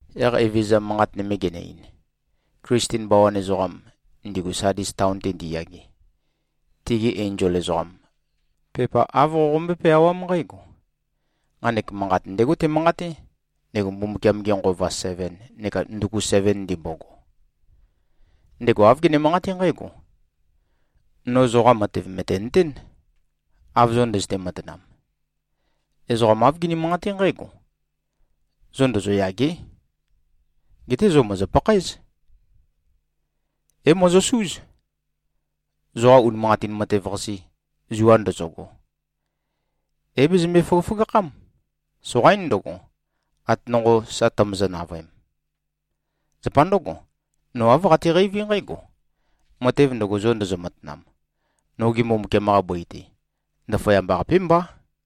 Yaq Evezøza manqat nøme genø-ein, “Klisten bawan ezoqam, ndigu Sadis taon-te ndiyage, tigi enzol ezoqam, pepa āv qoqombøé-peawám nqǽgo: Nqanek manqat ndégo temanqaté, ndego Mbumbukiam-ge Nqova seven neka nduku seven ndimbogo. Ndego āv gene-manqaté nqǽgo: No zoqa matev mø̀tenøtén, av zo ndøzøte-matanam. Ezoqa āv gini-manqaté nqǽgo: Zo ndozoyâgé. Geté zo mòzo-pakhaéz. É-mozosúz. Zoqa unimanqatin matev-qase, zua ndøzøgo, é-bezømbo-føgøføgakhám. Soqaín ndøgo, ate nonqo sa tømøzø-navøem. Zapa ndǿgo, no āv qateqeiví nqǽgo: Matev ndøgo, zo ndozo-matanam, noge Mbumbukiam-qa bøi-te, ndaføyamba-qapé mbá.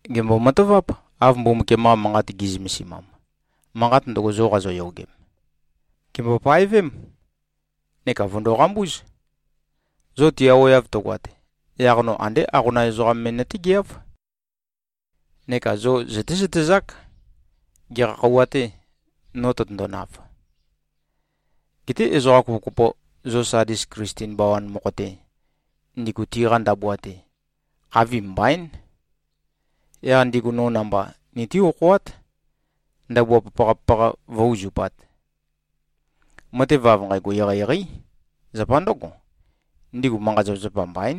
Gèmbo-mataváp, av Mbumbukiam-qa Manqat gi꞉zømesimam, manqat ndøgo, zo qazoyogem. Gèmbo-paevém, neka vø̀ndo-qambúz. Zo tiaweav tøgoat, yaq no andé aqonam ezoqam me nøtégeáv. Neka zo zøtézøtezák, gekha khøuwa-tē, no tøtøndonav. Geté ezoqa kopokopo, zo Sadis Klisten bawan mokho-te, ndigu tiqa ndabua-te, khavim mbaín. Yaq ndigu no namba nití-okhoát, ndabua papaqa-papaqa vǿ-uzupāt. Matev av nqægo eqeieqeí. Zapa ndǿgo, ndigu manqa-zapazapa mbaín.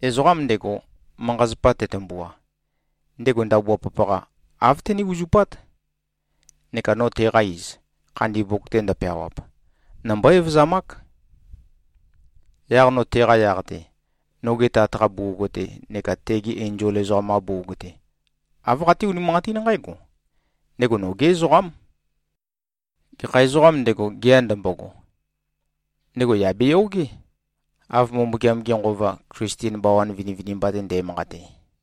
Ezoqam ndego, manqa-zapa tetømbua, ndego ndabua papaqa, āv tené-uzupát. Neka no teqa iz, khandi mbuk-te ndøpeawap, nombó-evøzamák. Yaq no teqa yaq-te, noge Tat-qa bugug-te neka tegi enzol ezoqam-qa bugug-te, āv qaté-unimanqatín nqǽgo: Ndego nogé ezoqám. Gekha ezoqām ndego, gea ndømbogo, ndego yà beyogé, av Mbumbukiam-ge Nqova, Klisten bawan vinivinimba-te nde꞉manqate.”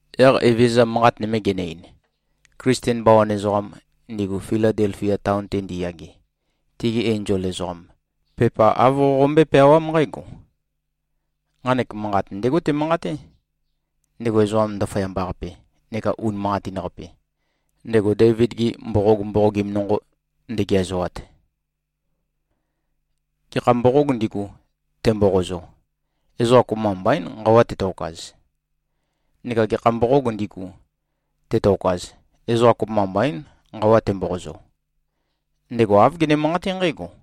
Yaq Evezøza manqat nøme genø-ein, “Klisten bawan ezoqam, ndigu Filadelfia taon-te ndiyage, tigi enzol ezoqam, pepa āv qoqombøé-peawám nqǽgo: Nqanek manqat ndégo temanqaté, ndego ezoqa ndaføyamba-qape neka unimanqatin-qape, ndego Deivid-gi mboqog mboqogim nonqo ndegeazoat. Gekha mboqōg ndigu, temboqozo, ezoqa kopømba mbaín, nqawa tetokaz. Neka gekha mboqōg ndigu, tetokaz, ezoqa kopømba mbaín, nqawa temboqozo. Ndego āv gene-manqaté nqǽgo: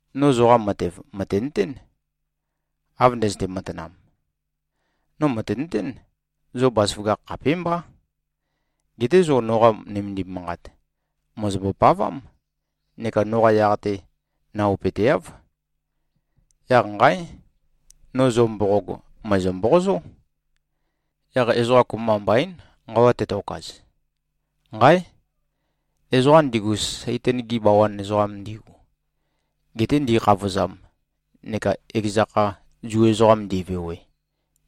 No zoqa matev mø̀tenøtén, av ndøzøte-matanam. No mø̀tenøtén, zo bazaføgakh khapémbá. Geté zo noqa nømendim manqat, mòzombo-pavám neka noqa yaq-te naopøteáv. Yaq nqáe! No zo mboqog, mø̀ezø-mboqozó. Yaq ezoqa kopømba mbaín, nqawa tetokaz. Nqáe! Ezoqa ndigu, Saitan-gi bawan ezoqam ndigu, gete ndi꞉khavozam neka ekeza kha Zu ezoqam ndi꞉vewe,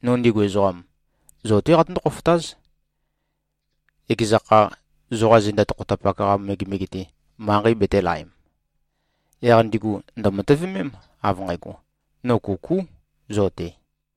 no ndigu ezoqam, zo-té qatøndó-khofotáz, ekeza kha, zoqa zenda tokhotapak-qa megemege-te, manqei betēlaem. Yaq ndigu ndø̀matøvemém, av nqægo, no kukú zo-te.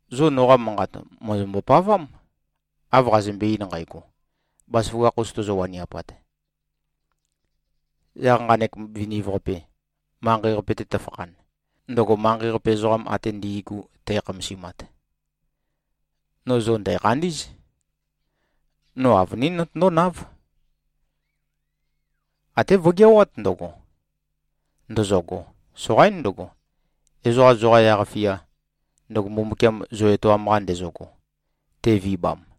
Zo noqa manqat mòzombo-pavám, av qazømbe-ein nqægo, bazaføgakh-us tozo-waniapat. Yaq nqanek viniv-qape manqei-qape-te tøfakhan, ndøgo manqei-qape ezoqam ate ndi꞉gu tækhamasimat, no zo ndæ̀khandí꞉z. No avønín notøndónáv. Até vøgeawát ndøgo, ndøzøgo. Soqaín ndøgo, ezoqa zoqa yaq-fia, ndøgo Mbumbukiam zo etoam-qa ndezøgo, te꞉vibam.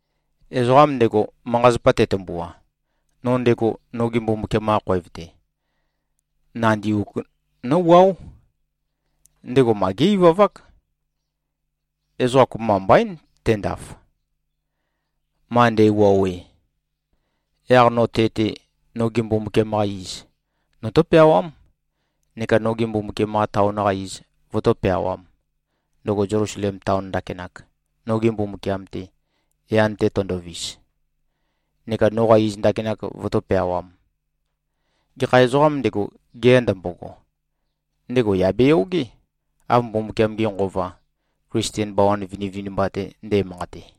Ezoqam ndego, manqa-zapa tetømbua, no ndego noge Mbumbukiam-qa khoev-te, nandi uk nówuáo. Ndego ma gé-ivavák. Ezoqa kopømba mbaín tendaf, ma nde꞉wuowe. Yaq no te-te, noge Mbumbukiam-qa iz, notó-peawám, neka noge Mbumbukiam-qa taon-qa iz, vøtó-peawām, ndøgo Zelusalem taon ndakinak, noge Mbumbukiam-te, yan-te tøndovis, neka noqa iz ndakinak vøtó-peawām. Gekha ezoqām ndego, gea ndømbogo, ndego yà beyogé, av Mbumbukiam-ge Nqova, Klisten bawan vinivinimba-te nde꞉manqate.”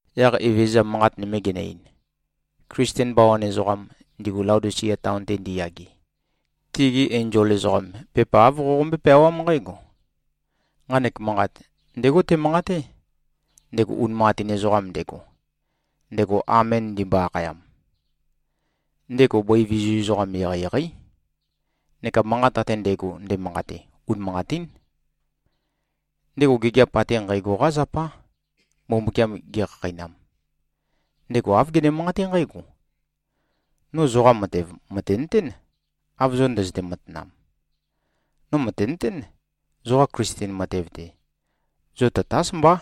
Yaq Evezøza manqat nøme genø-ein, “Klisten bawan ezoqam, ndigu Laodisia taon-te ndiyage, tigi enzol ezoqam, pepa āv qoqombøé-peawám nqǽgo: Nqanek manqat, ndégo temanqaté, ndego unimanqatin ezoqam ndego, ndego ‘Amen’ ndimbo-akhayam. Ndego bøi vizu ezoqam eqeieqeí, neka manqat ate ndægo, ndemanqate, unimanqatín. Ndego gigiap ate nqægo-qá zapá, Mbumbukiam gekhakheinam. Ndego āv gene-manqaté nqǽgo: No zoqa matev mø̀tenøtén, av zo ndøzøte-matanam. No mø̀tenøtén, zoqa Klisten matev-te, zo tatás mbá,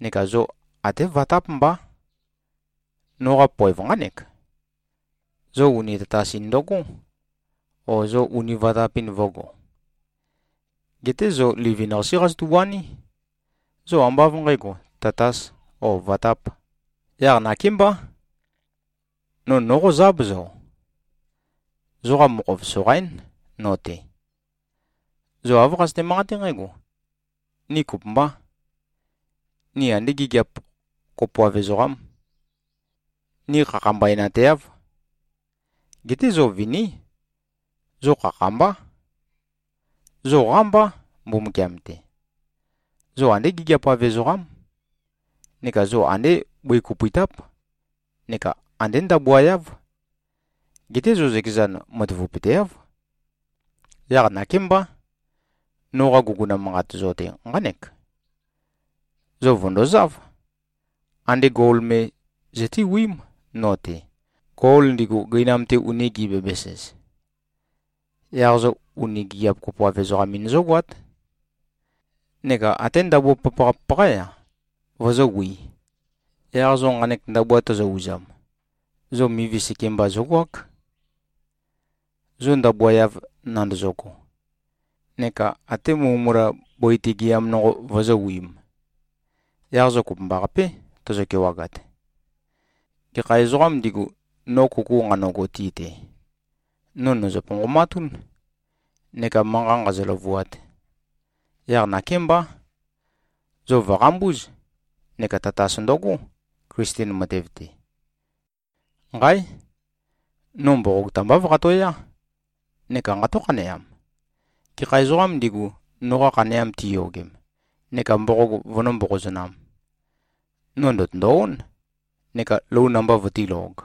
neka zo até vatáp mbá. Noqa poev nqánek: Zo uni tatas-in ndøgó, o, zo uni vatap-in vø̄go. Geté zo livin-qasé qazotu-waní. Zo ambá av nqǣgo, tatas o vatap. Yaq nakémbá, no nóqozáb, zo. Zoqa mokhov, soqaín, no-te. Zo āv qazøte-manqaté nqǽgo, ‘Ni kopømbá. Ni andé gigiap kopoav ezoqám. Ni khakhambaenteáv.’ Geté zo viní. Zo khakha-mbá. Zo qámbá, Mbumbukiam-te. Zo andé gigiap-av ezoqám. Neka zo andé bøi kopøitáp neka andé ndabua-yáv. Geté zo zøkezan matavapøteáv. Yaq nakémbá, noqa guguna manqat zo-te, nqánek: Zo vø̀ndozáv, andé gol me zøtéwiím no-te, gol ndigu gøinam-te uni gi꞉-bæbæs-ez. Yaq zo uni gigiap-kopoav-ezoqam-in zógoát. Neka até ndabua papaqa-papaqá-ya, vozówī. Yaq zo nqanek ndabua tozo-uzam, zo mivi sekemba zógoák, zo ndabua-yav nandozogo. Neka até mulømula, bøi-te gɨam nonqo vozówiīm. Yaq zo kopømbaqapé, tozo-kewagat. Gekha ezoqām ndigu, no kuku nqanøgo ti-te, no nø̀zø-ponqomatún, neka manqa nqāzø̄-lø̄vūāt. Yaq nakémbá, zo vø̀qambúz, neka tatas ndøgó, Klisten matev-te. Nqáe! No mboqog tambáv qatoyá neka nqató-khaneam. Gekha ezoqām ndigu, noqa khaneam tiyogem neka mboqog vønømbó-mboqozonām, no ndø̀tøndo-ón, neka lou namba vøtílōg.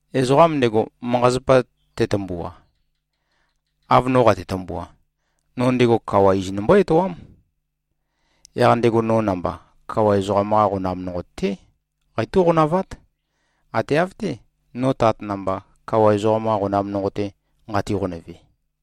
Ezoqam ndego, manqa-zapa tetømbua, av no qate-tømbua, no ndego kawa iz nombó-etoám. Yaq ndego no namba kawa ezoqam-qa qonam nonqo-té qeitó-qonavát, ate av-té, no Tat namba, kawa ezoqam-qa qonam nonqo-te nqati-qonøve.